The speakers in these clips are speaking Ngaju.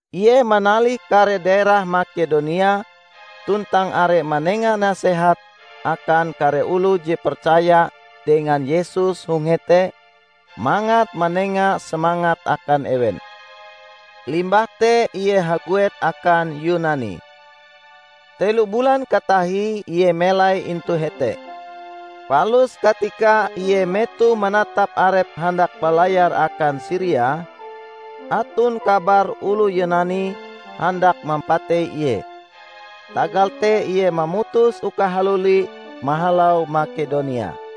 Ie manalih kare daerah Makedonia tuntang are manenga nasehat akan kare oloh je percaya dengan Yesus hong hete mangat manenga semangat akan ewen. Limbah te ie haguet akan Yunani. Telo bulan katahie ie melai intu hete. Palus katika ie metoh manatap arepe handak balayar akan Siria, aton kabar oloh Yunani handak mampatei ie. Tagal te ie mamutus uka haluli mahalau Makedonia.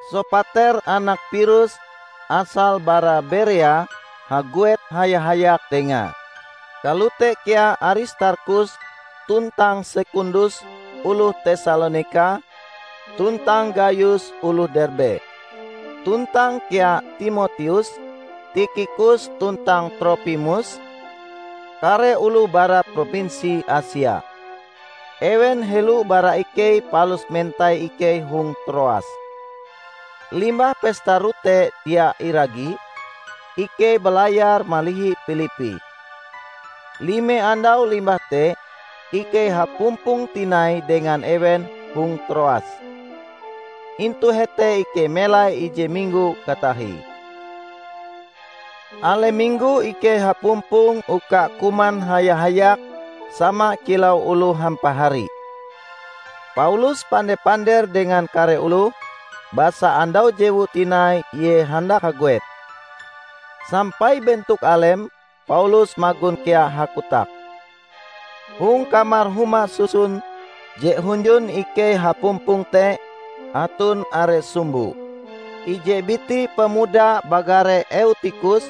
Sopater anak Pirus asal bara Berea haguet haya-hayak dengae; kalote kea Aristarkhus tuntang Sekundus oloh Tesalonika, tuntang Gayus oloh Derbe. Tuntang kea Timoteus, Tikhikus tuntang Tropimus, kare oloh bara Propinsi Asia. Ewen helo bara ikei palus mentai ikei hong Troas. Limbah Pesta Rote Dia Iragi, ikei balayar malihi Pilippi. Lime andau limbah te ikei hapumpong tinai dengan ewen hong Troas. Intu hete ikei melai ije minggo katahie. Alem minggo ikei hapumpong uka kuman haya-hayak sama kilau oloh hampahari. Paulus pande-pander dengan kare oloh, basa andau jewue tinai ie handak haguet. Sampai bentok alem Paulus magon kea hakotak. Hong kamar huma susun je hunjun ikei hapumpong te, aton are sumbo. Ije biti pemuda bagare Eutikhus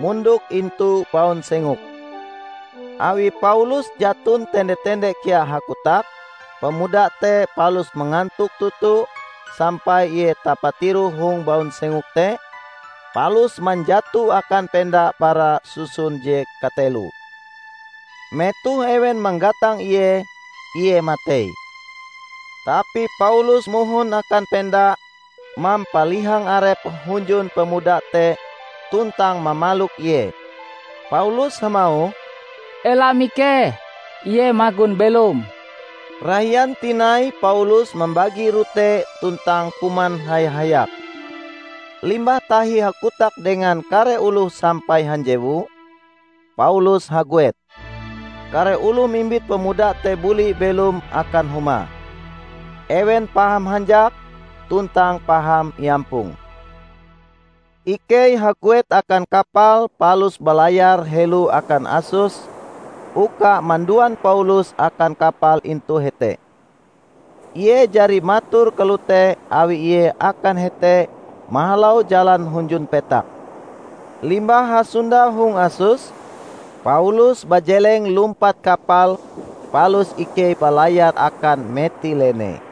mondok intu baunsengok. Awi Paulus jaton tende-tende kea hakotak, pemuda te palus mangantok toto sampai ie tapatiroh hong baunsengok te, palus manjato akan penda bara susun je kateloe. Metoh ewen manggatang ie, ie matei. Tapi Paulus mohon akan penda mampalihang arepe hunjun pemuda te tuntang mamalok ie. Paulus hamauh, "Ela mikeh, ie magon belom!" Rahian tinai Paulus mambagi rote tuntang kuman haya-hayak. Limbah tahi hakotak dengan kare oloh sampai hanjewu, Paulus haguet. Kare oloh mimbit pemuda te buli belom akan humae. Ewen paham hanjak tuntang paham iampong. Ikei haguet akan kapal palus balayar helo akan Asos uka manduan Paulus akan kapal intu hete. Ie jari mator kalote awi ie akan hete mahalau jalan hunjun petak. Limbah hasondau hong Asos, Paulus bajeleng lumpat kapal palus ikei balayar akan Metilene.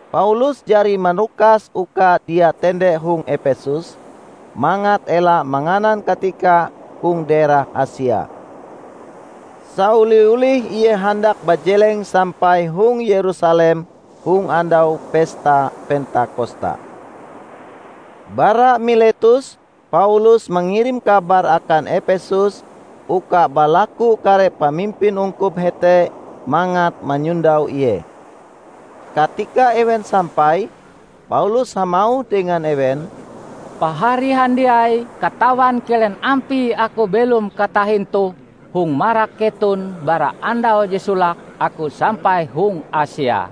Paulus jari manukas uka dia tende hong Epesus, mangat ela manganan katika hong daerah Asia. Saoli-olih ie handak bajeleng sampai hong Yerusalem hong andau Pesta Pentakosta. Bara Miletus Paulus mangirim kabar akan Epesus uka balaku kare pamimpin ungkup hete mangat manyondau ie. Katika ewen sampai, Paulus hamauh dengan ewen, "Pahari handiai katawan kilen ampie aku belom katahin toh hong marak keton bara andau je solake aku sampai hong Asia.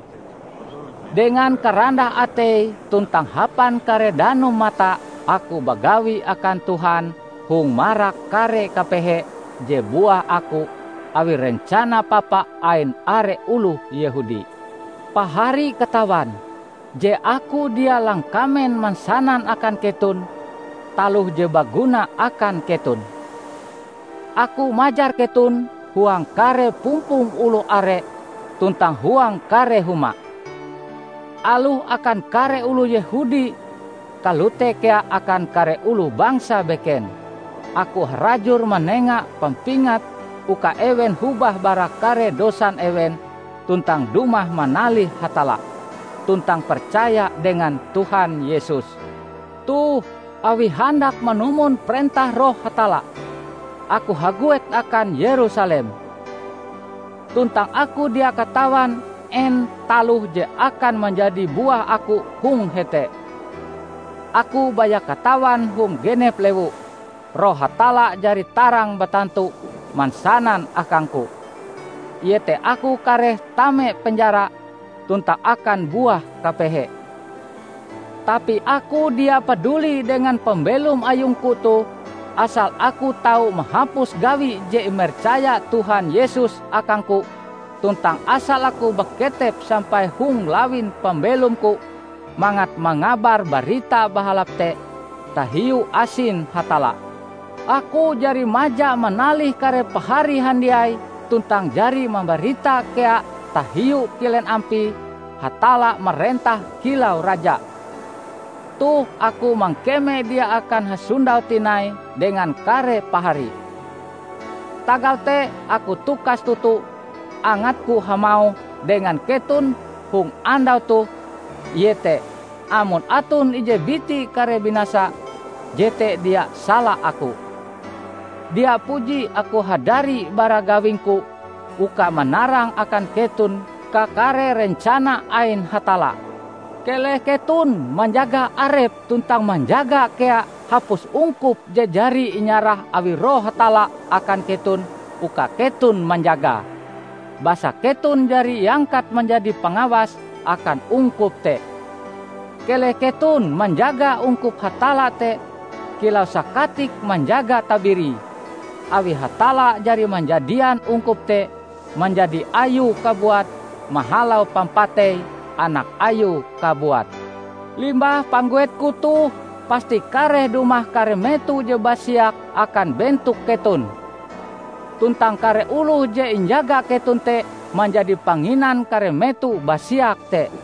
Dengan karandah atei tuntang hapan kare danum mata aku bagawi akan Tuhan hong marak kare kapehe je buah aku awi rencana papa ain are oloh Yehudi. Pahari katawan je aku dia langkamen mansanan akan keton taloh je baguna akan keton. Aku majar keton huang kare pumpong oloh are tuntang huang kare huma. Aloh akan kare oloh Yehudi kalote kea akan kare oloh bangsa beken aku harajur manenga pampingat uka ewen hobah bara kare dosan ewen tuntang dumah manalih Hatalla, tuntang percaya dengan Tuhan Yesus. Toh, awi handak manumon parentah Roh Hatalla, aku haguet akan Yerusalem. Tuntang aku dia katawan en taloh je akan manjadi buah aku hong hete. Aku baya katawan hong genep lewu, Roh Hatalla jari tarang batantu mansanan akangku, iete aku kareh tame penjara tuntang akan buah kapehe. Tapi aku dia paduli dengan pambelom ayungku toh asal aku tau mahapus gawi je imercaya Tuhan Yesus akangku tuntang asal aku baketep sampai hong lawin pambelomku mangat mangabar Barita Bahalap te tahiu asin Hatalla. Aku jari maja manalih kare pahari handiai tuntang jari mambarita kea tahiu kilen ampie Hatalla marentah kilau Raja. Toh aku mangkeme dia akan hasondau tinai dengan kare pahari. Tagal te aku tukas toto angatku hamauh dengan keton hong andau toh iete amon aton ije biti kareh binasa, jete dia sala aku. Dia puji aku hadari bara gawingku uka manarang akan keton kakare rencana ain Hatalla. Keleh keton manjaga arep tuntang manjaga kea hapus ungkup je jari inyarah awi Roh Hatalla akan keton uka keton manjagae; basa keton jari iangkat manjadi pangawas akan ungkup te. Keleh keton manjaga ungkup Hatalla te kilau sakatik manjaga tabirie, awi Hatalla jari manjadian ungkup te manjadi Ayue kabuat mahalau pampatei Anak Ayue kabuat. Limbah pangguetku toh pasti kareh dumah kare meto je basiak akan bentok keton. Tuntang kare oloh je injaga keton te manjadi panginan kare meto basiak te.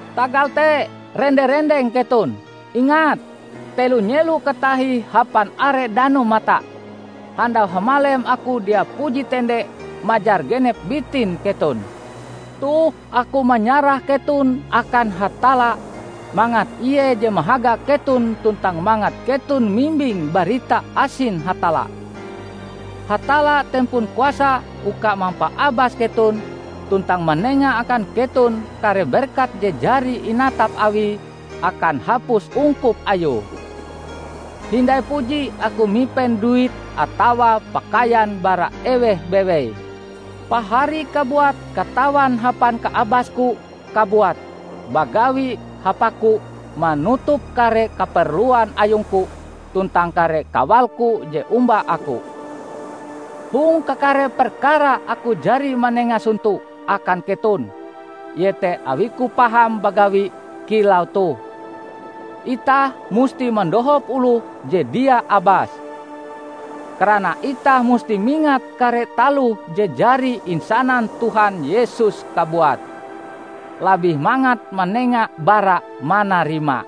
Tagal te rende-rendeng keton! Ingat, telo nyelo katahie hapan are danum mata, handau hamalem aku dia puji tende majar genep bitin keton. Toh aku manyarah keton akan Hatalla mangat Ie je mahaga keton tuntang mangat keton mimbing barita asin Hatalla. Hatalla tempon kuasa uka mampaabas keton tuntang manenga akan keton kare berkat je jari inatap Awie akan hapus ungkup Ayue. Hindai puji aku mipen duit atawa pakaian bara eweh bewei. Pahari kabuat katawan hapan kaabasku kabuat bagawi hapaku manutup kare kaperluan ayungku tuntang kare kawalku je omba aku. Hong kakare perkara aku jari manenga sonto akan keton iete awiku paham bagawi kilau toh, itah musti mandohop oloh je dia abas. Karana itah musti mingat kare taloh je jari insanan Tuhan Yesus kabuat, 'Labih mangat manenga bara manarima.' "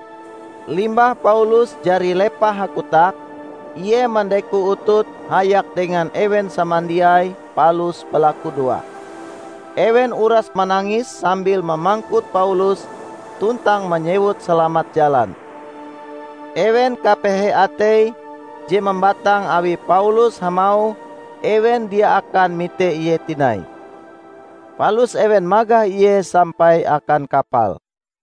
Limbah Paulus jari lepah hakotak, ie mandeko utute hayak dengan ewen samandiai palus balakudoa. Ewen uras manangis sambil mamangkut Paulus tuntang manyewut salamat jalan. Ewen kapehe atei je mambatang awi Paulus hamauh ewen dia akan mite ie tinai. Palus ewen magah ie sampai akan kapal.